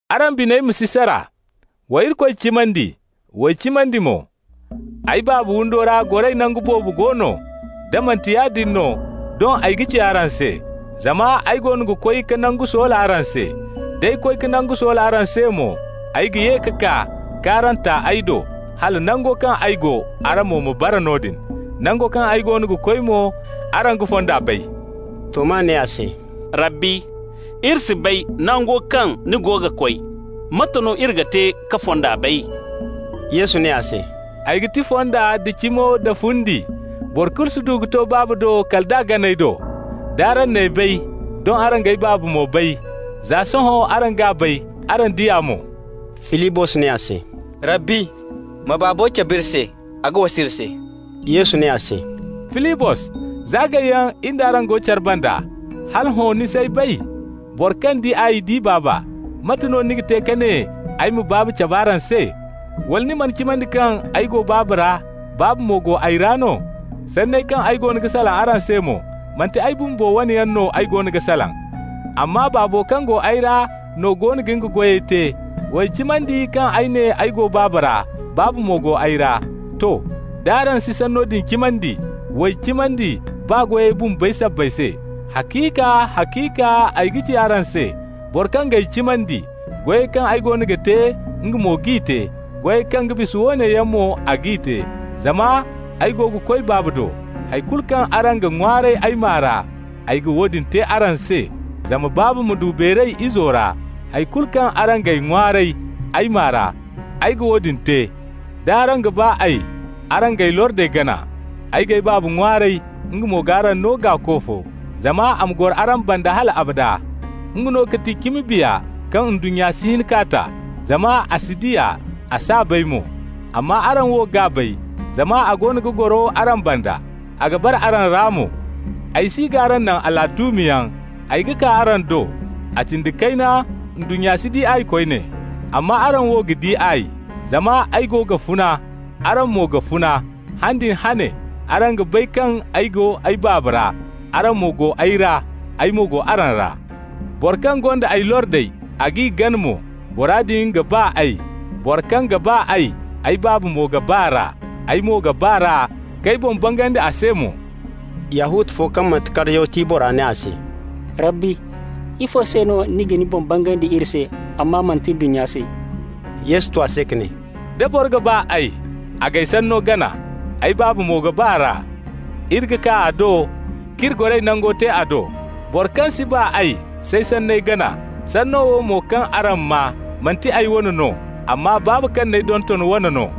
«Araŋ biney ma si sara. Wa Irikoy cimandi, w'ay cimandi mo. Ay Baaba windo ra goray nangu boobo go no. Da manti yaadin no, doŋ ay ga ci araŋ se, zama ay goono ga koy ka nangu soola araŋ se. D'ay koy ka nango soola araŋ se mo, ay ga ye ka kaa k'araŋ ta ay do, hala nango kaŋ ay go, araŋ mo ma bara noodin. Nango kaŋ ay goono ga koy mo, araŋ ga fonda bay.» Toma ne a se: «Rabbi, iri si bay nango kaŋ ni goono ga koy. Mate no iri ga te ka fonda bay?» Yesu ne a se: «Ay ga ti fonda nda cimo da fundi. Boro kulu si du ka to Baabo do kal ay do. D'araŋ n'ay bay, doŋ araŋ g'ay Baaba mo bay. Za sohõ araŋ g'a bay, araŋ di a mo.» Filibos ne a se: «Rabbi, ma Baabo cab'iri se, a ga wasa iri se.» Yesu ne a se: «Filibos, za gayyaŋ in d'araŋ go care banda, hala hõ ni s'ay bay? Boro kaŋ di ay di Baaba. Mate no ni ga te ka ne ay ma Baaba cabe araŋ se? Wala ni mana cimandi kaŋ ay go Baaba ra, Baaba mo go ay ra no? Sanney kaŋ ay goono ga salaŋ araŋ se mo, manti ay bumbo wane yaŋ no ay goono ga salaŋ, amma Baabo kaŋ go ay ra no goono ga nga goyey te. W'ay cimandi kaŋ ay ne ay go Baaba ra, Baaba mo go ay ra. To, d'araŋ si sanno din cimandi, w'ay cimandi baa goyey bumbey sabbay se. Haciika, haciika ay ga ci araŋ se: boro kaŋ g'ay cimandi, goyey kaŋ ay goono ga te, nga mo g'i te. Goyey kaŋ ga bisa woone yaŋ mo a g'i te, zama ay go ga koy Baaba do. Hay kulu kaŋ araŋ ga ŋwaaray ay maa ra, ay ga woodin te araŋ se, zama Baaba ma du beeray Izo ra. Hay kulu kaŋ araŋ g'ay ŋwaaray ay maa ra, ay ga woodin te. D'araŋ ga ba ay, araŋ g'ay lordey gana. Ay g'ay Baaba ŋwaaray, nga mo g'araŋ no Gaako fo, zama a ma goro araŋ banda hal abada. Nga no ga ti cimi Biya kaŋ ndunnya si hin k'a ta, zama a si di a, a s'a bay mo. Amma araŋ wo g'a bay, zama a goono ga goro araŋ banda, a ga bara araŋ ra mo. Ay si g'araŋ naŋ alatuumiyaŋ, ay ga kaa araŋ do. A cindi kayna ndunnya si di ay koyne, amma araŋ wo ga di ay. Zama ay go ga funa, araŋ mo ga funa. Han din hane araŋ ga bay kaŋ ay go ay Baaba ra, araŋ mo go ay ra, ay mo go araŋ ra. Boro kaŋ gonda ay lordey, a g'i gana mo, bora din ga ba ay. Boro kaŋ ga ba ay, ay Baaba mo ga ba r'a. Ay mo ga ba r'a, k'ay boŋ bangandi a se mo.» Yahuta fo kaŋ manti Kariyoti bora ne a se: «Rabbi, ifo se no ni ga ni boŋ bangandi iri se, amma manti ndunnya se?» Yesu tu a se ka ne: «Da boro ga ba ay, a g'ay sanno gana. Ay Baaba mo ga ba r'a. Iri ga kaa a do, k'iri goray nango te a do. Boro kaŋ si ba ay s'ay sanney gana. Sanno wo mo kaŋ araŋ maa, manti ay wane no, amma Baaba kaŋ n'ay donton wane no.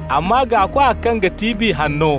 Amma Gaakwa kaŋ ga ti Biya Hanno,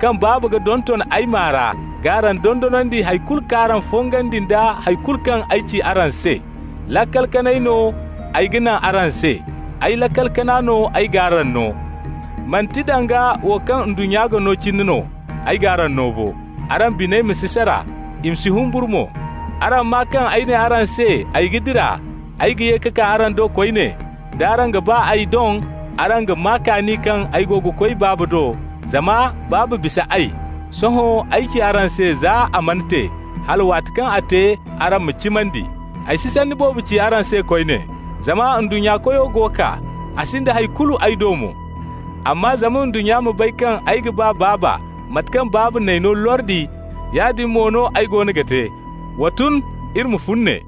kaŋ Baaba ga donton ay maa ra g'araŋ dondonandi hay kulu k'araŋ fongandi nda hay kulu kaŋ ay ci araŋ se. Laakal kanay no ay ga naŋ araŋ se, ay laakal kana no ay g'araŋ no. Manti danga wo kaŋ ndunnya ga no cine no ay g'araŋ no bo. Araŋ biney ma si sara, i ma si humburu mo. Araŋ maa kaŋ ay ne araŋ se ay ga dira, ay ga ye ka kaa araŋ do koyne. D'araŋ ga ba ay, doŋ araŋ ga maa kaani kaŋ ay go ga koy Baaba do, zama Baaba bisa ay. Sohõ ay ci araŋ se za a mana te, hala waati kaŋ a te araŋ ma cimandi. Ay si sanni boobo ci araŋ se koyne, zama ndunnya koyo go kaa, a sinda hay kulu ay do mo. Amma zama ndunnya ma bay kaŋ ay ga ba Baaba, mate kaŋ Baaba n'ay no lordi, yaadin mo no ay goono ga te. Wa tun, iri ma fun ne.